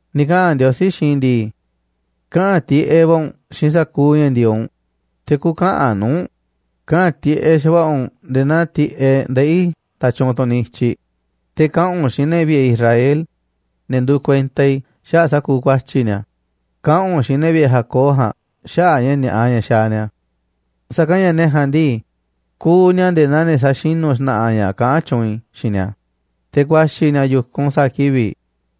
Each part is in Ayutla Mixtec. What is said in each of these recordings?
Ni̱ kaꞌa̱n Ndiosí xiinꞌ i̱ ndii: “Kaꞌa̱n tiꞌeꞌ va̱ u̱nꞌ xiinꞌ sa̱kuuꞌ ña̱ ndi̱e̱eꞌ u̱nꞌ, te̱ kü̱ka̱ꞌa̱n nuu̱ꞌ u̱nꞌ. Kaꞌa̱n tiꞌeꞌ xa̱va̱ꞌa̱ u̱nꞌ nde̱e̱ naa tiꞌeꞌ ndeꞌí nda̱tyuunꞌ tunꞌ niꞌiꞌ i̱tyiꞌ, te̱ kaꞌa̱n u̱nꞌ xiinꞌ ne̱ vi̱ꞌe̱ Israel, ne̱ nduuꞌ kuenta i̱, xaꞌa̱ꞌ sa̱kuuꞌ ku̱a̱tyi̱ ni̱a̱. Kaꞌa̱n u̱nꞌ xiinꞌ ne̱ vi̱ꞌe̱ Jacob ja̱a̱nꞌ xaꞌa̱ꞌ ña̱ ni̱a̱ꞌa ña̱ xaaꞌ ni̱a̱. Sa̱kanꞌ ña̱ ne̱ ja̱a̱nꞌ ndii, kuuꞌ ni̱a̱ nde̱e̱ naa ne̱ sa̱xinu̱ xna̱ꞌa̱ ña̱ kaꞌán tyuunꞌ i̱ xiinꞌ ni̱a̱, te̱ ku̱a̱xi̱ ni̱a̱ yu̱kunꞌ sa̱a̱ kivi̱ꞌ,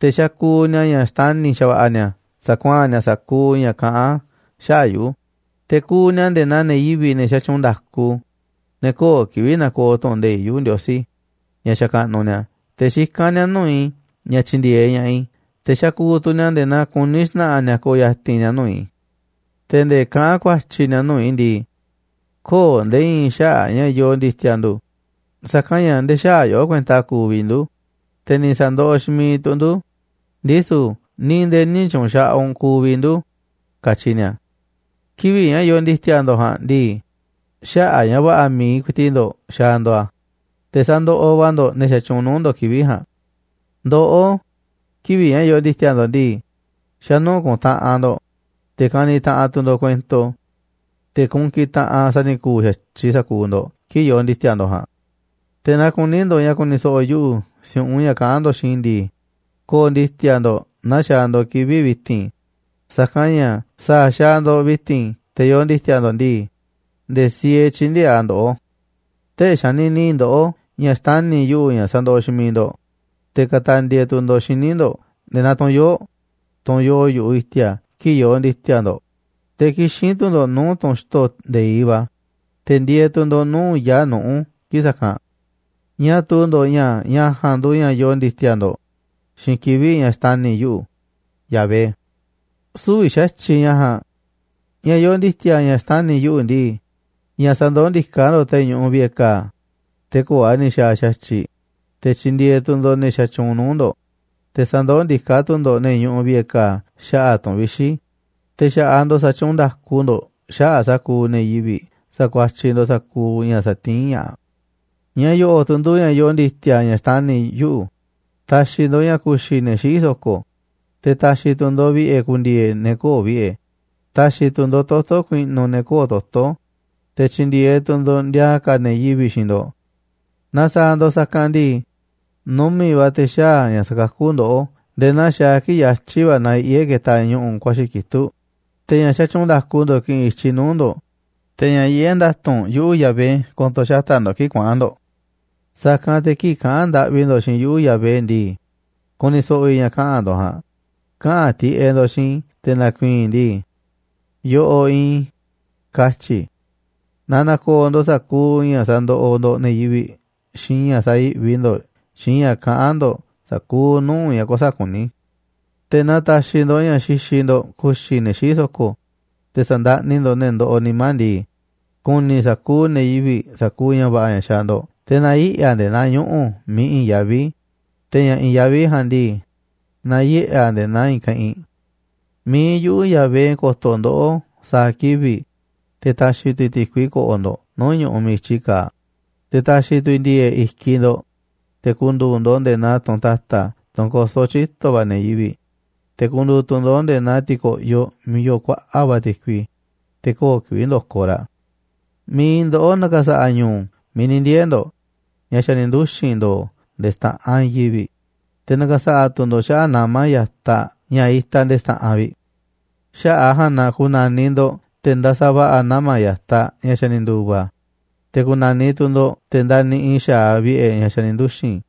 te̱ xakuuꞌ ni̱a̱ ña̱ xtani̱ xa̱va̱ꞌa̱ ni̱a̱ sa̱kuaa̱n ni̱a̱ sa̱kuuꞌ ña̱ kaꞌán xaꞌa̱ꞌ yuꞌu̱. Te̱ kuuꞌ ni̱a̱ nde̱e̱ naa ne̱ yivi̱ꞌ, ne̱ xatyuunꞌ nda̱ku, ne̱ köo̱ꞌ kivi̱ꞌ na̱ko̱o̱ tu̱ꞌu̱n nde̱iꞌ yuꞌu̱, Ndiosí ña̱ xakaꞌnuꞌ ni̱a̱. Te̱ xikán ni̱a̱ nuu̱ꞌ i̱ ña̱ tyi̱ndi̱e̱eꞌ ña̱ꞌaꞌ i̱, te̱ xakuuꞌ tu̱ ni̱a̱ nde̱e̱ naa kuní xna̱ꞌa̱ ni̱a̱ ko̱o̱ ya̱ti̱n ni̱a̱ nuu̱ꞌ i̱. Te̱ nde̱e̱ kaꞌán ku̱a̱tyi̱ ni̱a̱ nuu̱ꞌ i̱ ndii: Köo̱ꞌ nde̱e̱ i̱i̱n xaꞌa̱ꞌ ña̱ yoo ndi̱ti̱a̱ ndu̱, sa̱kanꞌ ña̱ nde̱e̱ xäaꞌ yoꞌó kuenta kuuꞌ vi̱ꞌ ndu̱, te̱ ni̱ sa̱ndoꞌoꞌ xiinꞌ miiꞌ tu̱ ndu̱, ndisu̱ ni̱ nde̱e̱ nï̱ tyu̱u̱n xaꞌaꞌ u̱nꞌ kuuꞌ vi̱ꞌ ndu̱, katyi ni̱a̱. ’Kivi̱ꞌ ña̱ yoo ndi̱ti̱a̱ ndo̱ꞌ ja̱a̱nꞌ ndii, xaꞌa̱ꞌ ña̱ va̱ꞌa̱ mi̱iꞌ ku̱i̱ti̱ꞌ ndo̱ꞌ xaaꞌ ndo̱ꞌ a̱, te̱ sandoꞌoꞌ va̱ ndo̱ꞌ ne̱ xatyuunꞌ nuu̱ꞌ ndo̱ꞌ kivi̱ꞌ ja̱a̱nꞌ. Ndoꞌó, kivi̱ꞌ ña̱ yoo ndi̱ti̱a̱ ndo̱ꞌ ndii, xa̱ nuu̱ꞌ kuntaꞌanꞌ ndo̱ꞌ, te̱ kaniꞌ taꞌanꞌ tu̱ ndo̱ꞌ kuento. Te̱ kunkiꞌ taꞌanꞌ sa̱ni̱ku̱u̱ xa̱tyiꞌ sa̱kuuꞌ ndo̱ꞌ kii̱ꞌ yoo ndi̱ti̱a̱ ndo̱ꞌ ja̱a̱nꞌ. Te̱ naaꞌ kuní ndo̱ꞌ ña̱ ku̱ni̱ so̱ꞌo̱ yuꞌu̱ si̱u̱ꞌunꞌ ña̱ kaꞌán ndo̱ꞌ xiinꞌ i̱ ndii, kö̱o̱ꞌ ndi̱ti̱a̱ ndo̱ꞌ naa xaaꞌ ndo̱ꞌ kivi̱ꞌ vi̱ti̱n. Sa̱kanꞌ ña̱ sa̱a̱ xaaꞌ ndo̱ꞌ vi̱ti̱n te̱ yoo ndi̱ti̱a̱ ndo̱ꞌ ndii, nde̱e̱ siee tyï̱ndi̱e̱eꞌ a̱ ndoꞌó. Tee̱ꞌ xanini ndoꞌó ña̱ xtani̱ yuꞌu̱ ña̱ sandoꞌoꞌ xiinꞌ miiꞌ ndo̱ꞌ, te̱ katandie tu̱ ndo̱ꞌ xíniꞌ ndo̱ꞌ nde̱e̱ naa tunꞌ yoo̱ꞌ, tunꞌ yoo yu̱ꞌuꞌ i̱ti̱a̱ kii̱ꞌ yoo ndi̱ti̱a̱ ndo̱ꞌ. Te̱ kixín tu̱ ndo̱ꞌ nuu̱ꞌ tunꞌ xto̱ nde̱iꞌ va̱, te̱ ndieeꞌ tu̱ ndo̱ꞌ nuu̱ꞌ yaa̱ꞌ nuꞌu̱ kii̱ꞌ sa̱kanꞌ. ¿Ñáá tuu ndo̱ꞌ ña̱ ña̱ ja̱a̱nꞌ nduuꞌ ña̱ yoo ndi̱ti̱a̱ ndo̱ꞌ xiinꞌ kivi̱ꞌ ña̱ xtani̱ yuꞌu̱, Yahvé? ’Sü̱vi̱ xa̱tyiꞌ ña̱ ja̱a̱nꞌ. Ña̱ yoo ndi̱ti̱a̱ ña̱ xtani̱ yuꞌu̱ ndii, ña̱ sa̱ndoó ndiká ndo̱ꞌ te̱ ñuꞌuꞌ vi̱ꞌe̱ ka̱a̱, te̱ köo̱ꞌ a̱ ni̱ xa̱a̱ xa̱tyiꞌ. Te̱ tyi̱ndi̱e̱eꞌ tu̱ ndo̱ꞌ ne̱ xatyuunꞌ nuu̱ꞌ ndo̱ꞌ, te̱ sa̱ndoó ndiká tu̱ ndo̱ꞌ ne̱ ñuꞌuꞌ vi̱ꞌe̱ ka̱a̱ xaꞌa̱ꞌ tu̱n vixi̱. Te̱ xa̱ꞌaꞌ ndo̱ꞌ sa̱tyuunꞌ nda̱ku ndo̱ꞌ xaꞌa̱ꞌ sa̱kuuꞌ ne̱ yivi̱ꞌ sa̱kuatyiꞌ ndo̱ꞌ sa̱kuuꞌ ña̱ satiín ña̱ꞌaꞌ. Ña̱ yo̱ꞌo̱ꞌ tuꞌ nduuꞌ ña̱ yoo ndi̱ti̱a̱ ña̱ xtani̱ yuꞌu̱, ta̱xi̱ ndo̱ꞌ ña̱ ku̱xi̱ ne̱ xiꞌí so̱ko̱, te̱ ta̱xi̱ tu̱ ndo̱ꞌ vi̱ꞌe̱ ku̱ndi̱e̱e̱ ne̱ köo̱ꞌ vi̱ꞌe̱. Ta̱xi̱ tu̱ ndo̱ꞌ toto̱ ku̱i̱ꞌnu̱ ne̱ köo̱ꞌ toto̱, te̱ tyi̱ndi̱e̱eꞌ tu̱ ndo̱ꞌ ndiaa ka̱ ne̱ yivi̱ꞌ xiinꞌ ndo̱ꞌ. ’Naaꞌ sa̱a̱ ndo̱ꞌ sa̱kanꞌ ndii, numi̱ꞌ va̱ te̱ xaa̱ ña̱ sa̱kakú ndoꞌó nde̱e̱ naa xaaꞌ kii̱ꞌ yatyi̱ va̱ nayiꞌé ketaꞌ ñu̱ꞌu̱ ku̱a̱xi̱ kitúꞌ. Te̱ ña̱ xatyuunꞌ nda̱ku ndo̱ꞌ ki̱ꞌi̱n i̱tyiꞌ nuu̱ꞌ ndo̱ꞌ, te̱ ña̱ yiꞌé nda̱tu̱nꞌ yuꞌu̱ Yahvé ko̱to̱ xata̱ꞌ ndo̱ꞌ kii̱ꞌ kuaꞌa̱n ndo̱ꞌ. Sa̱kanꞌ te̱ kii̱ꞌ kaꞌa̱n ndaꞌvi ndo̱ꞌ xiinꞌ yuꞌu̱, Yahvé ndii, ku̱ni̱ so̱ꞌo̱ i̱ ña̱ kaꞌa̱n ndo̱ꞌ ja̱a̱nꞌ. Kaꞌa̱n tiꞌeꞌ ndo̱ꞌ xiinꞌ i̱ te̱ na̱ku̱i̱i̱n i̱ ndii: Yoꞌoꞌ iinꞌ i̱, katyi̱ i̱. Naaꞌ na̱ko̱o̱ ndo̱ꞌ sa̱kuuꞌ ña̱ sandoꞌoꞌ ndo̱ꞌ ne̱ yivi̱ꞌ xiinꞌ ña̱ sayi̱ꞌvi ndo̱ꞌ xiinꞌ ña̱ kaꞌán ndo̱ꞌ sa̱kuuꞌ nuu̱ꞌ ña̱ kuäsa̱ꞌ kuní. ’Te̱ naaꞌ ta̱xi̱ ndo̱ꞌ ña̱ xixiꞌ ndo̱ꞌ ku̱xi̱ ne̱ xiꞌí so̱ko̱, te̱ sa̱ndaꞌni ndo̱ꞌ ne̱ ndoꞌoꞌ nimá ndii, ku̱ni̱ sa̱kuuꞌ ne̱ yivi̱ꞌ sa̱kuuꞌ ña̱ va̱ꞌa̱ ña̱ xaaꞌ ndo̱ꞌ. Te̱ na̱yiꞌe̱ a̱ nde̱e̱ naa ñuꞌu̱ miiꞌ i̱i̱n yaví, te̱ ña̱ i̱i̱n yaví ja̱a̱nꞌ ndii, na̱yiꞌe̱ a̱ nde̱e̱ naa i̱i̱n keꞌinꞌ. Mi̱iꞌ yuꞌu̱, Yahvé, ko̱to̱ ndoꞌó sa̱a̱ kivi̱ꞌ, te̱ ta̱xi̱ tu̱ i̱ ti̱kui ko̱ꞌo̱ ndo̱ꞌ nuu̱ꞌ ñu̱ꞌuꞌ miiꞌ i̱tyi kaaꞌ. Te̱ ta̱xi̱ tu̱ i̱ ndi̱e̱e̱ꞌ i̱kiꞌ ndo̱ꞌ, te̱ ku̱ndu̱u̱ ndo̱ꞌ nde̱e̱ naa tunꞌ ta̱ta̱ tunꞌ kosó tyito̱ va̱ ne̱ yivi̱ꞌ, te̱ ku̱ndu̱u̱ tu̱ ndo̱ꞌ nde̱e̱ naa ti̱ko̱ꞌyoꞌ miiꞌ yoo kuaꞌa̱ꞌ va̱ ti̱kui, te̱ köo̱ꞌ kivi̱ꞌ ndokoꞌ raꞌ. Mi̱iꞌ ndoꞌó na̱ka̱sa̱ꞌa̱ ñu̱u̱ miiꞌ ni̱ ndiee̱ ndo̱ꞌ ña̱ xa̱ ni̱ nduxi̱n ndo̱o̱ nde̱e̱ xta̱ꞌanꞌ i̱i̱n yivi̱ꞌ, te̱ na̱ka̱sa̱ꞌa̱ tu̱ ndo̱ꞌ xaꞌa̱ꞌ nama̱ ya̱taꞌ ña̱ itaꞌ nde̱e̱ xta̱ꞌanꞌ vi̱ꞌ. Xaꞌa̱ꞌ a̱ ja̱a̱nꞌ na ku̱na̱niꞌ ndo̱ꞌ te̱ ndasaꞌ va̱ꞌa̱ nama̱ ya̱taꞌ ña̱ xa̱ ni̱ ndu̱va̱. Te̱ ku̱na̱niꞌ tu̱ ndo̱ꞌ te̱ ndaniꞌiꞌ xa̱aꞌ vi̱ꞌe̱ ña̱ xa̱ ni̱ nduxi̱n.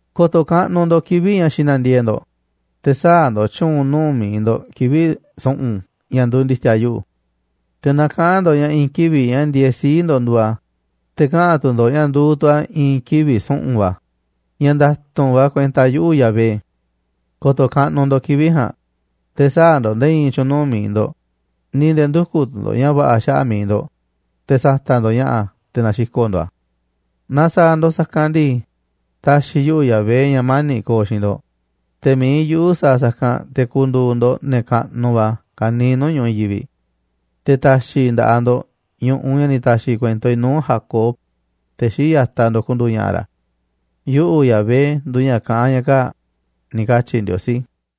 ’Ko̱to̱ kaꞌnuꞌ ndo̱ꞌ kivi̱ꞌ ña̱ xina̱ndiee̱ꞌ ndo̱ꞌ, te̱ sä̱a̱ ndo̱ꞌ tyu̱u̱n nuu̱ꞌ mi̱iꞌ ndo̱ꞌ kivi̱ꞌ su̱ꞌu̱n ña̱ nduuꞌ ndi̱ti̱a̱ yuꞌu̱. Te̱ na kaꞌa̱n ndo̱ꞌ ña̱ i̱i̱n kivi̱ꞌ ña̱ ndiee̱ sii̱ꞌ ndo̱ꞌ nduuꞌ a̱, te̱ kaꞌa̱n tu̱ ndo̱ꞌ ña̱ nduuꞌ tu̱ a̱ i̱i̱n kivi̱ꞌ su̱ꞌu̱n va̱, ña̱ nda̱tu̱nꞌ va̱ kuenta yuꞌu̱, Yahvé. Ko̱to̱ kaꞌnuꞌ ndo̱ꞌ kivi̱ꞌ ja̱a̱nꞌ, te̱ sä̱a̱ ndo̱ꞌ nde̱e̱ i̱i̱n tyu̱u̱n nuu̱ꞌ mi̱iꞌ ndo̱ꞌ, ni̱ nde̱e̱ ndü̱kuꞌ tu̱ ndo̱ꞌ ña̱ va̱ꞌa̱ xaꞌa̱ꞌ mi̱iꞌ ndo̱ꞌ, te̱ sa̱ta̱ꞌ ndo̱ꞌ ña̱ꞌa̱ te̱ na̱xiko̱ꞌ ndo̱ꞌ a̱. Naaꞌ sa̱a̱ ndo̱ꞌ sa̱kanꞌ ndii, ta̱xi̱ yuꞌu̱, Yahvé, ña̱ mani̱ꞌ ko̱o̱ xiinꞌ ndo̱ꞌ, te̱ mi̱iꞌ yuꞌu̱ sa̱a̱ sa̱kanꞌ te̱ ku̱ndu̱u̱ ndo̱ꞌ ne̱ kaꞌnuꞌ va̱ ka̱niiꞌ nuu̱ꞌ ñu̱ꞌuꞌ i̱i̱n yivi̱ꞌ. Te̱ ta̱xi̱ i̱ nda̱ꞌaꞌ ndo̱ꞌ ñu̱ꞌuꞌ ña̱ ni̱ ta̱xi̱ kuento i̱ nuu̱ꞌ Jacob, te̱ xii̱ꞌ ya̱taꞌ ndo̱ꞌ, ku̱ndu̱u̱ ña̱ꞌa̱ ra̱. ’Yuꞌu̱, Yahvé nduuꞌ ña̱ kaꞌán ña̱ kaa̱ꞌ”, ni̱ katyi̱ Ndiosí.